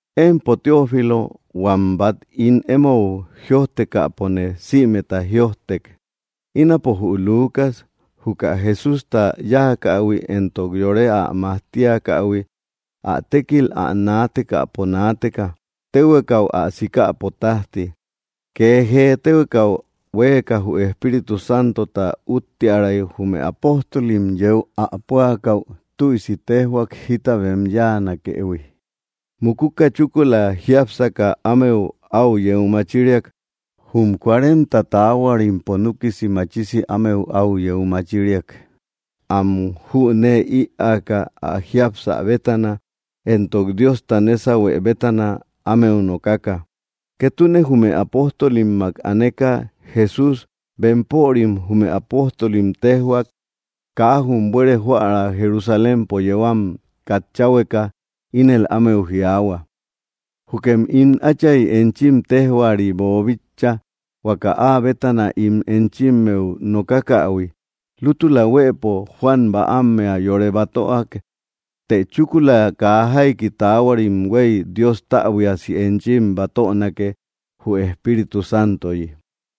Empo Teófilo, huam bat ín emou jïojtekäpone sïmeta jïojtek, ínapo jü Lucas, juka Jesústa yáakähui éntok yore ä majtiakähui, ä tékil ä naatekäpo naateka, téhuekau ä sikäpo tajti. Kee jee téhuekau huéeka jü Espíritu Santota úttiäray jume apóstolim yéu ä púakäu tüisi téjhuak jita bem yáanakëhui. Mukuka, chúkula jiápsaka ámeu au yeu machiriak. Jum cuarenta taahuarimpo núkisi machisi ámeu au yeu machiriak, am jünee ïaaka ä jiapsä bétana, éntok Diosta nésauhuë bétana ámeu nokaka. Ketune jume apóstolimmak aneka, Jesús bempörim, jume apóstolim, téjhuak kaa jum buere joära Jerusalémpo yéu am katchahueka. Ínel ámeu jiaahua: —Jukem ín Átchay enchim téjhuari boobíchaïhui, huaka áa bétana ín enchimmeu nokakähui. Lútula huëpo Juan bäammea yore batöak, të chúkula kaa jaiki taahuarim huei Dios täbuiasi enchim batönake, jü Espíritu Santoyi.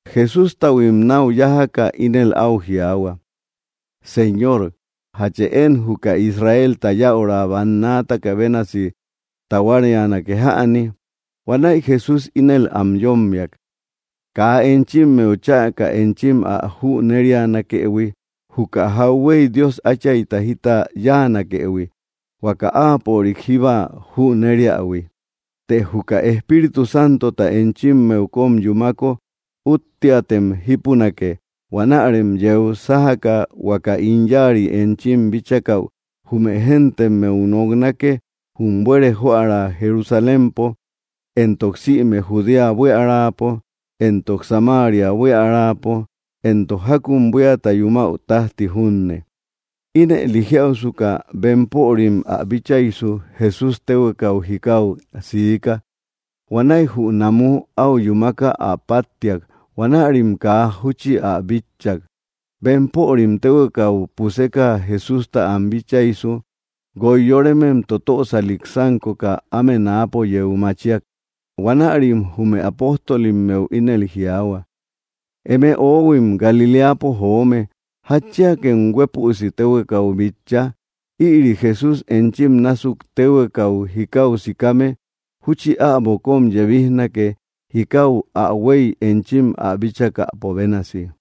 Jesústahuim nau yájaka ínel au jiaahua: —Señor, ¿jatchë én juka Israelta yäura bannaataka bénasi tahuárianake jäni? Huanäi Jesús ínel am yómmiak: —Kaa enchimmeu chäka enchim ä jünérianakëhui juka jauhuey Dios Áchayta jita yáanakëhui, huaka áapörik jíba jüneriähui. Të juka Espíritu Santota enchimmeu kom yumáko útteatem jípunake, huanärem yeu sájaka huaka ín yáari enchim bíchakäu jume géntemmeu noknake jum buere joära Jerusalémpo, éntok sïme Judea buíaräpo éntok Samária buíaräpo, éntok jakum buíata yumäu tajti junne. Ínëli jiáusuka, bempörim ä bíchaisu, Jesús téhuekau jikáu siika. Huanäi jü namú au yúmaka ä páttiak. Huanärim kaa júchi ä bitchak. Bempörim téhuekau puseka Jesústa am bíchaisu, guoi yorémem totösalik sánkoka áme náapo yeu machíak. Huanärim jume apóstolimmeu ínel jiaahua: —Eme oóhuim Galiléapo joome, ¿jatchiakem huépüsi téhuekau bitcha? Ïri Jesús enchim násuk téhuekau jikau sikame júchi äbo kom yebijnake jikau ä huey enchim ä bíchakäpo bénasi.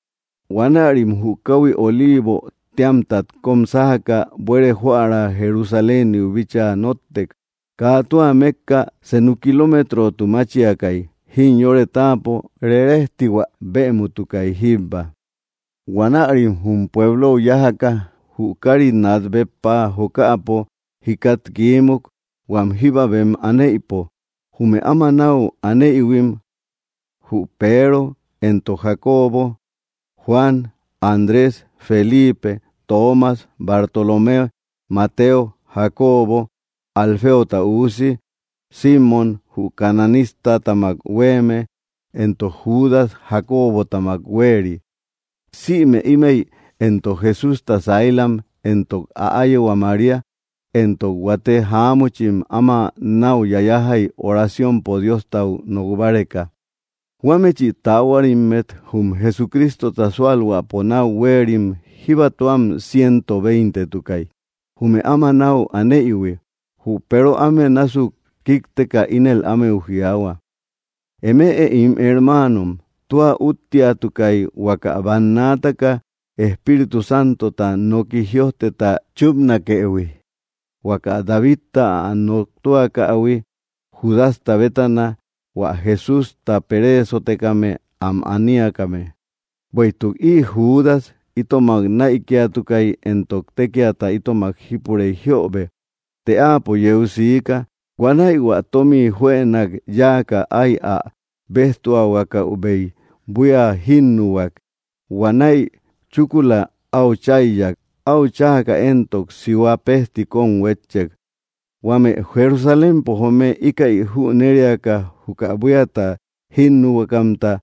Huanärim jü kauhui Oliivo téamtat kóm sájaka buere joära Jerusaléniu bíchaa nóttek. Kaa tua mekka, senu kilometrotu máchiakay, jimyore táapo rerejtihua bëmutukay jíbba. Huanärim jum pueblou yájaka, jü kari nat béppa jokäpo jikat kiímuk, huam jíba bem anéïpo. Jume áma nau anéïhuim: Jü Peero, éntok Jacobo, Juan, Andrés, Felipe, Toomas, Bartolomé, Mateo, Jacobo Alféota üusi, Simmom jü cananístammak huéeme, éntok Judas Jakóbotamak huéeri. Sïme ímëi éntok Jesústa saílam, éntok ä áyehua María, éntok huate jaámuchim, áma nau yayajai oraciompo Diostau nok báreka. Huámechi taahuarimmet jum Jesucristota súalhuäpo nau huéerim jíbatuam ciento veintetukay, jume áma náu aneïhui; jü Peero áme násuk kíkteka ínel ámeu jiaahua: —Eme ín hermaanom, tua útteatukay huaka bannaataka Espíritu Santota noki jïojteta chúpnakëhui, huaka Davidta ä noktuakähui Judasta bétana, hua Jesústa pereesotekame am aniakame. Bueïtuk ï Judas itomak näikiatukai, éntok tékiata itomak jípurei jiöbe, të áapo yeu siika. Huanäi hua tomi juënak yáaka ái ä béjtuahuakäubei buía jínnuhuak. Huanäi chúkula au cháiyak. Áu cháaka éntok, sihua pejti kón huétchek. Huame Jerusalémpo joome íkäi jüneriaka, juka buíata jínnuhuakamta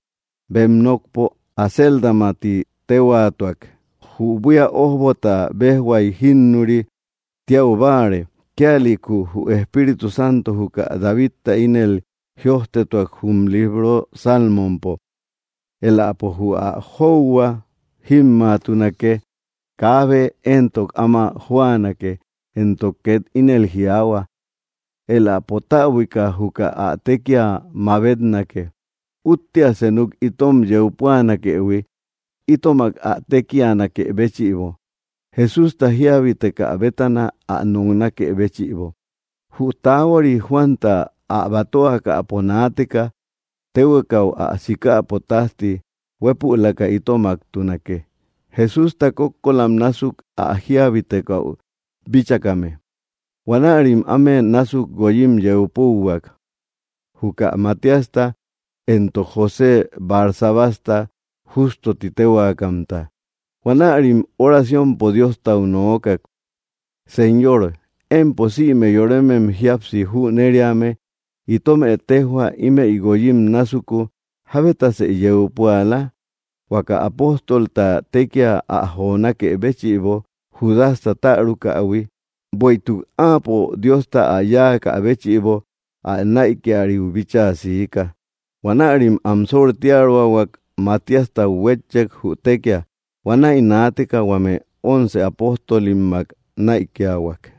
bem nokpo Acéldama ti téhuaatuak, jü buía ójbota béjhuai jínnuri tiau báare. Kíalïku jü Espíritu Santo juka Davidta ínel jïojtetuak jum libro Salmompo: Éläpo jü ä jóuhua jímmaatunake; kaabe éntok áma jóanake. Éntok ket ínel jiaahua: Éläpo täbuika juka ä tékia mabetnake. ’Úttea senuk itom yeu púanakëhui itomak ä tékianakë béchïbo, Jesústa jíabitekä bétana ä noknakë béchïbo. Jü tahuari Juanta ä batöakäpo naateka téhuekau ä sikäpo tajti huepülaka itomaktunake, Jesústa kókkolam násuk ä jiabitekäu bíchakame. Huanärim áme násuk guoyim yeu púuhuak: Juka Matíasta, éntok José Barsabasta, Justo titéhuaakamta. Huanärim oraciompo Diostau nookak: —Señor, empo sïme yorémem jíapsi jünériame, itómë tejhua ímëi guoyim násuku jábetasë yeu púala, huaka apóstolta tekia ä jonákë béchïbo Judasta tärukähui, bueïtuk áapo Diosta áa yáaka béchïbo ä näikiariu bíchaa siika. Huanärim am sortiaroahuak, Matiastat huétchek, jü tékia. Huanäi naateka huame once apóstolimmak näikiahuak.